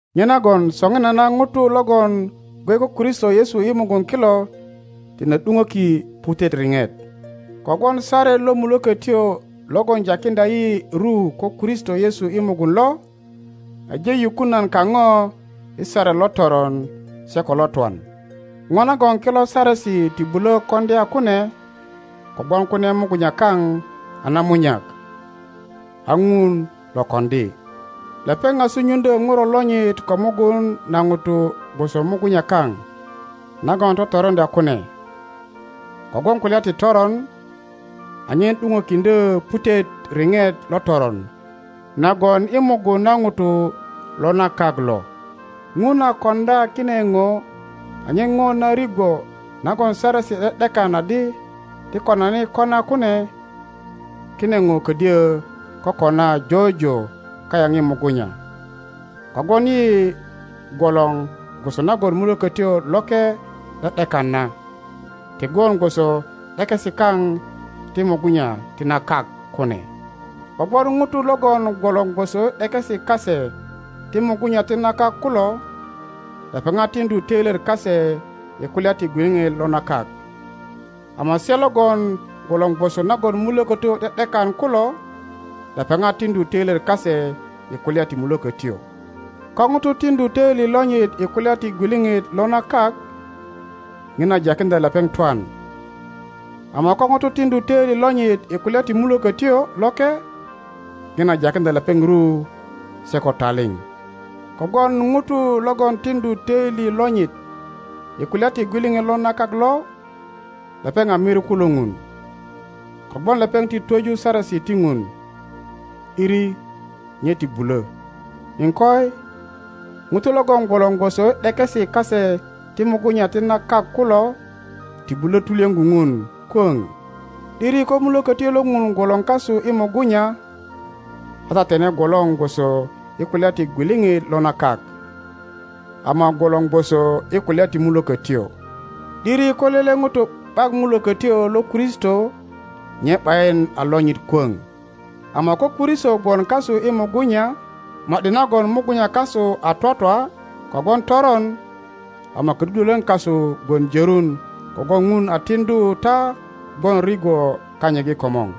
Nyenagon soŋinana ŋutu logongwe ko Kristo Yesu i mugun kilo tine ’duŋöki putet riŋet. Kogwon saret lo Mulökötyo logon jakiŋdya yi ru ko Kristo Yesu i mugun lo, aje yukun nan kaŋo i saret lo toron se ko lo twan. Ŋo nagon kilo Saresi ti bulö koŋdya kune kogwon kune mugunya kaŋ a namunyak, a Ŋun lo koŋdi. Lepeŋ a sunyuŋdyö Ŋuro lonyit ko mugun na Ŋuto gwoso mugunya kaŋ nagon totoroŋdya kune, kogwon kulya ti toron, anyen ’duŋökiŋdyö putet riŋet lo toron na gwon i mugun na ŋuto lo la kak lo. Ŋun a koŋdya kine ŋo anyen ŋo na rigwo nagon Saresi ’de ’dekan adi ti konani kona kune, kine ŋo ködyo kokona jojo kayaŋ i mugunya, kogwon yi gwolor gwoso nagon Mulökötyo Loke ’de ’dekan na, ti gwon gwoso ’dekesi kaŋ ti mugunya ti na kak kune. Kogwon ŋutu logon gwolor gwosoi ’dekesi kase ti mugunya ti na kak kulo, lepeŋat tiŋdu toilyet kase i kulya ti gwiliŋit lo na kak, ama se logon gwolor gwoso nagon Mulökötyo ’de ’dekan kulo, lepeŋat tiŋdu töilyet kase i kulya ti Mulökötyo. Ko ŋuto tiŋdu töili lonyit i kulya ti gwiliŋit lo na kak, ŋina jakiŋdya lepeŋ twan, ama ko ŋuto tiŋdu töili lonyit i kulya ti Mulökötyo Loke, ŋina jakiŋdya lepeŋ ru se ko taliŋ. Kogwon ŋuto logon tiŋdu töili lonyit i kulya ti gwiliŋit lo na kak lo, lepeŋ a miriku lo Ŋun, kogwon lepeŋ ti twöju saresi ti Ŋun, ’diri nye ti bulö. Iŋkoi, ŋutu logon gwolor gwoso i ’dekesi kase ti mugunya ti na kak kulo ti bulö tulyöŋo Ŋun kwöŋ. ’Diri ko Mulökötyo lo Ŋun gwolor kasu i mugunya, a ta tine gwolor gwoso i kulya ti gwiliŋit lo na kak, ama gwolor gwoso i kulya ti Mulökötyo. ’Diri ko lele ŋuto ’bak Mulökötyo lo Kristo nye ’bayin a lonyit kwöŋ. Ama ko Kristo gwon kasu i mugunya, ma ’di nagon mugunya kasu a twatwa kogwon toron, ama ködudwölön kasu gwon jörun kogwon Ŋun a tiŋdu ta gwon rigwo kanyit i komor.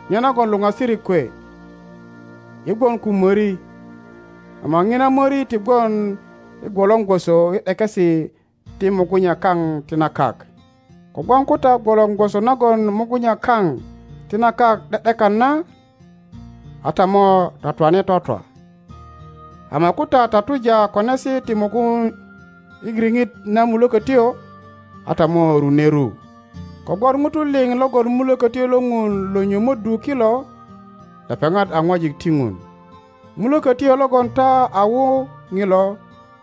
Nyenagon luŋasirik kwe, yi gwon ko möri, ama ŋina möri ti gwon i gwolor gwoso i ’dekesi ti mugunya kaŋ ti na kak. Kogwon ko ta gwolor gwoso nagon mugunya kaŋ ti na kak ’de ’dekan na, a ta mo twatwane twatwa, ama ko ta tatuja konesi ti mugun i riŋit na Mulökötyo a ta mo rune ru. Kogwon ŋutu liŋ logon Mulökötyo lo Ŋun lo nyömöddu kilo, lepeŋat a ŋwajik ti Ŋun. Mulökötyo logon ta a wu ŋilo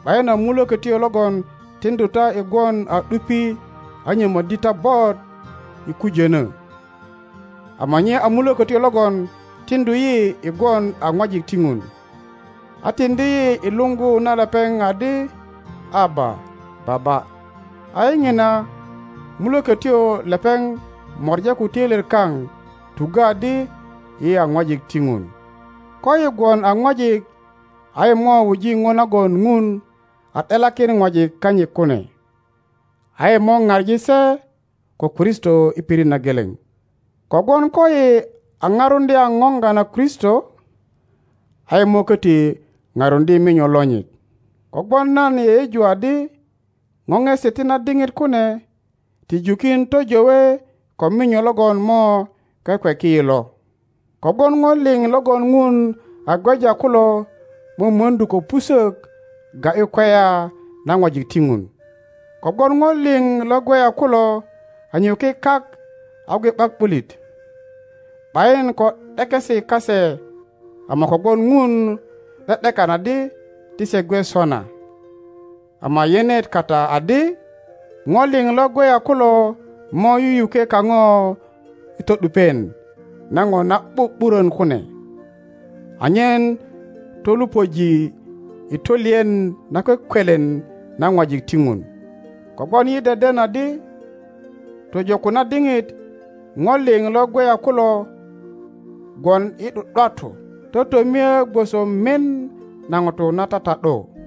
’bayin a mulökötyo logon tiŋdu ta i gwon a ’dupi a nyömöddi ta bot i kujönö, ama nye a Mulökötyo logon tiŋdu yi i gwon a ŋwajik ti Ŋun, a tiŋdi yi i luŋgu na lepeŋ adi, Aba, Baba! I ŋina Mulökötyo lepeŋ mora ko töilyet kaŋ tuggö adi yi a ŋwajik ti Ŋun. Koyi gwon a ŋwajik a yi mo wuji ŋo nagon Ŋun a ’delakin ŋwajik kanyit kune, a yi mo ŋaŋi se ko Kristo i pirit na geleŋ. Kogwon koyi a ŋarundya ŋoŋga na Kristo, a yi mo köti paruŋdye minyo lonyit. Kogwon nan yeyeju adi ŋoŋesi ti na diŋit kune ti jukin töjowe ko minyo logon mo kwekweki yi lo. Kogwon ŋo liŋ logon Ŋun a gweja kulo mömönau ko pusök ga ’yu kweya na ŋwajik ti Ŋun. Kogwon ŋo liŋ lo gweya kulo a nyökwe kak a gwe ’bak ’bulit, ’bayin ko ’dekesi kase ama kogwon Ŋun ’de ’dekan adi ti se gwe sona. Ama yenet kata adi ŋo liŋ lo gweya kulo mo yuyukwe kaŋo i to ’dupien na ŋo na ’bu ’burön kune, anyen tolupöji i tolien nakwekwelen na ŋwajik ti Ŋun. Kogwon yi deden adi tojo ko na diŋit ŋo liŋ lo gweya kulo gwon i ’du ’duatu, totomie gwoso mien na ŋuto na tata ’du;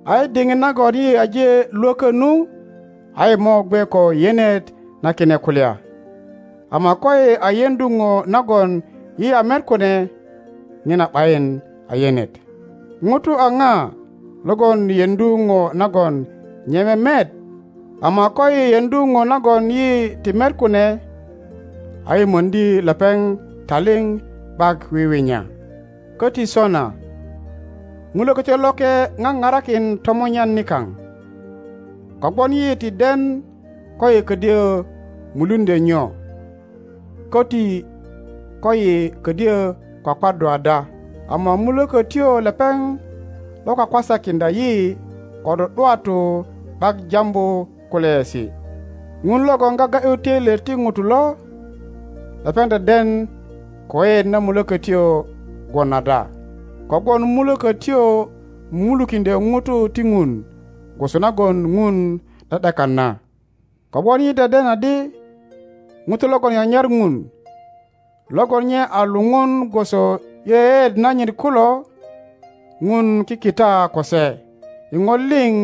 a i diŋit nagon yi aje lwökö nu a yi mo gwe ko yenet na kine kulya, ama koyi a yeŋdu ŋo nagon yi a met kune, ŋina ’bayin a yenet. Ŋuto a ŋa logon yeŋdu ŋo nagon nye memet? Ama koyi yeŋdu ŋo nagon yi ti met kune, a yi möŋdi lepeŋ taliŋ ’bak wiwinya. Köti sona Mulökötyo Loke ŋaŋarakin tomunyan nikaŋ, kogwon yi ti den koyi ködyö muluŋdyö nyo, köti koyi ködyö kwakwaddu ada, ama Mulökötyo lepeŋ lo kwa kwa sakiŋdya yi ko ’du ’duatu ’bak jambu kulyaesi. Ŋun logon gaga ’yu töilyet ti ŋutu lo, lepeŋ deden ko yeyeet na Mulökötyo gwon ada, kogwon Mulökötyo mumulukiŋdyö ŋutu ti Ŋun gwoso nagon Ŋun ’de ’dekan na; kogwon yi deden adi ŋutu logon nyanyar Ŋun, logon nye a luŋun gwoso i yeyeet nanyit kulo, Ŋun kikita ko se i ŋo liŋ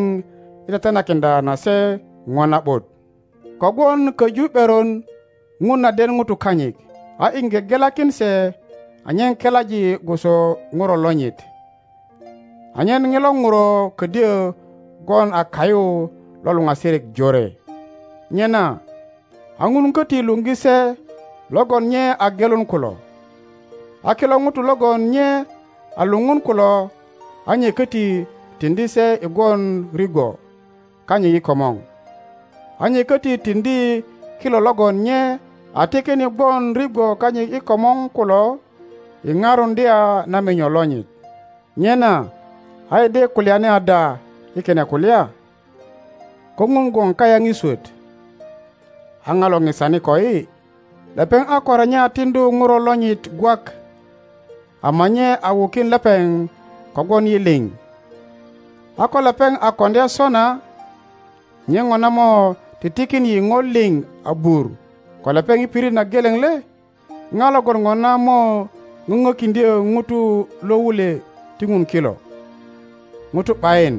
i tetenakiŋdya na se ŋo na ’but. Kogwon köju ’beron Ŋun a den ŋutu kanyit, a iŋge gelakin se anyen kelaji gwoso Ŋuro lonyit, anyen ŋilo Ŋuro ködyö gwon a kayu lo luŋasirik jore. Nyena a Ŋun köti luŋgi se logon nye a gelun kulo; a kilo ŋutu logon nye a luŋun kulo a nye köti tiŋdi se i gwon rigwo kanyit i komor; a nye köti tiŋdi kilo logon nye a tikin i gwon rigwo kanyit i komor kulo i parundya na minyo lonyit. Nyena a yi de kulyani ada i kine kulya? Ko Ŋun gwon kayaŋ i swöt, a ŋa lo ŋisani koyi? Lepeŋ a ko renya tiŋdu Ŋuro lonyit gwak, ama nye a wukin lepeŋ kogwon yi liŋ. A ko lepeŋ a koŋdya sona, nye ŋona mo ti tikin yi ŋo liŋ abur ko lepeŋ i pirit na geleŋ le? Ŋa logon ŋona mo ŋöŋökiŋdyö ŋutu lo wulwe ti Ŋun kilo? Ŋutu ’bayin,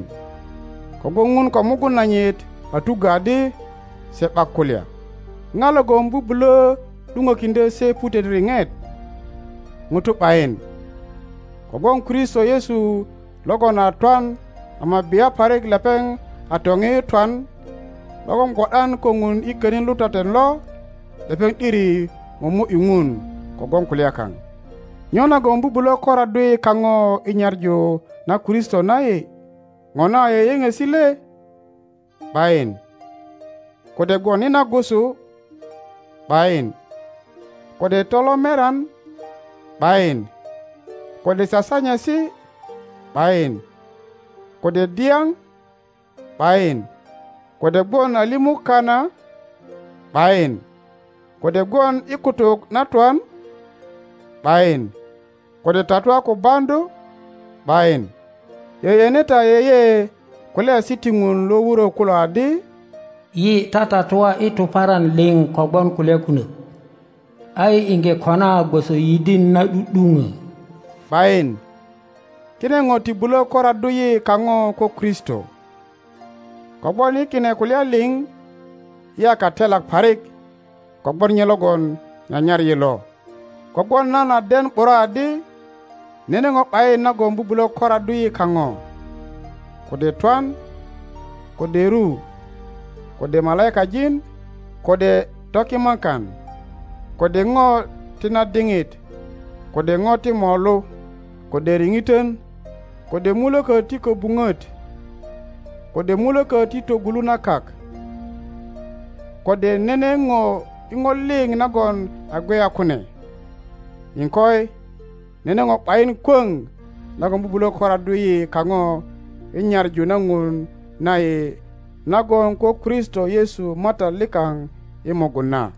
kogwon Ŋun ko mugun nanyit a tuggö adi se ’bak kulya. Ŋa logon bubulö ’duŋökiŋdyö se putet riŋet? Ŋuto ’bayin, kogwon Kristo Yesu logon a twan—ama bia parik lepeŋ a toŋiyu i twan, —logon gwo ’dan ko Ŋun i könin lutaten lo, lepeŋ ’diri momo ’yu Ŋun kogwon kulya kaŋ. Nyo nagon bubulö koraddu yi kaŋo i nyaŋu na Kristo na yi? Ŋona a yöyöŋesi le? ’Bayin. Kode gwon i nagusu? ’Bayin. Kode tolomerian? ’Bayin. Kode sasanyesi? ’Bayin. Kode dyaŋ? ’Bayin. Kode gwon a limu kana? ’Bayin. Kode gwon i kutuk na twan? ’Bayin. Kode tatua ko baŋdu? ’Bayin. Yeyene ta yeye kulyaesi ti Ŋun lo wurö kulo adi, Yi tatatua i tuparan liŋ kogwon kulya kunök, a yi iŋge kona gwoso yidin na ’du ’duŋö. ’Bayin, kine ŋo ti bulö koraddu yi kaŋo ko Kristo, kogwon i kine kulya liŋ yi a katelak parik kogwon nye logon nyanyar yi lo. Kogwon nan a den ’bura adi nene ŋo ’bayin nagon bubulö koraddu yi kaŋo, kode twan, kode ru, kode malaikajin, kode tokimakan, kode ŋo ti na diŋit, kode ŋo ti molu, kode riŋitön, kode mulökö ti köbuŋöt, kode mulökö ti toŋolu na kak, kode nene ŋo i ŋo liŋ nagon a gweya kune, iŋkoi, nene ŋo ’bayin kwöŋ nagon bubulö koraddu yi kaŋo i nyaŋu na Ŋun na yi na gwon ko Kristo Yesu Matat likaŋ i mugun na.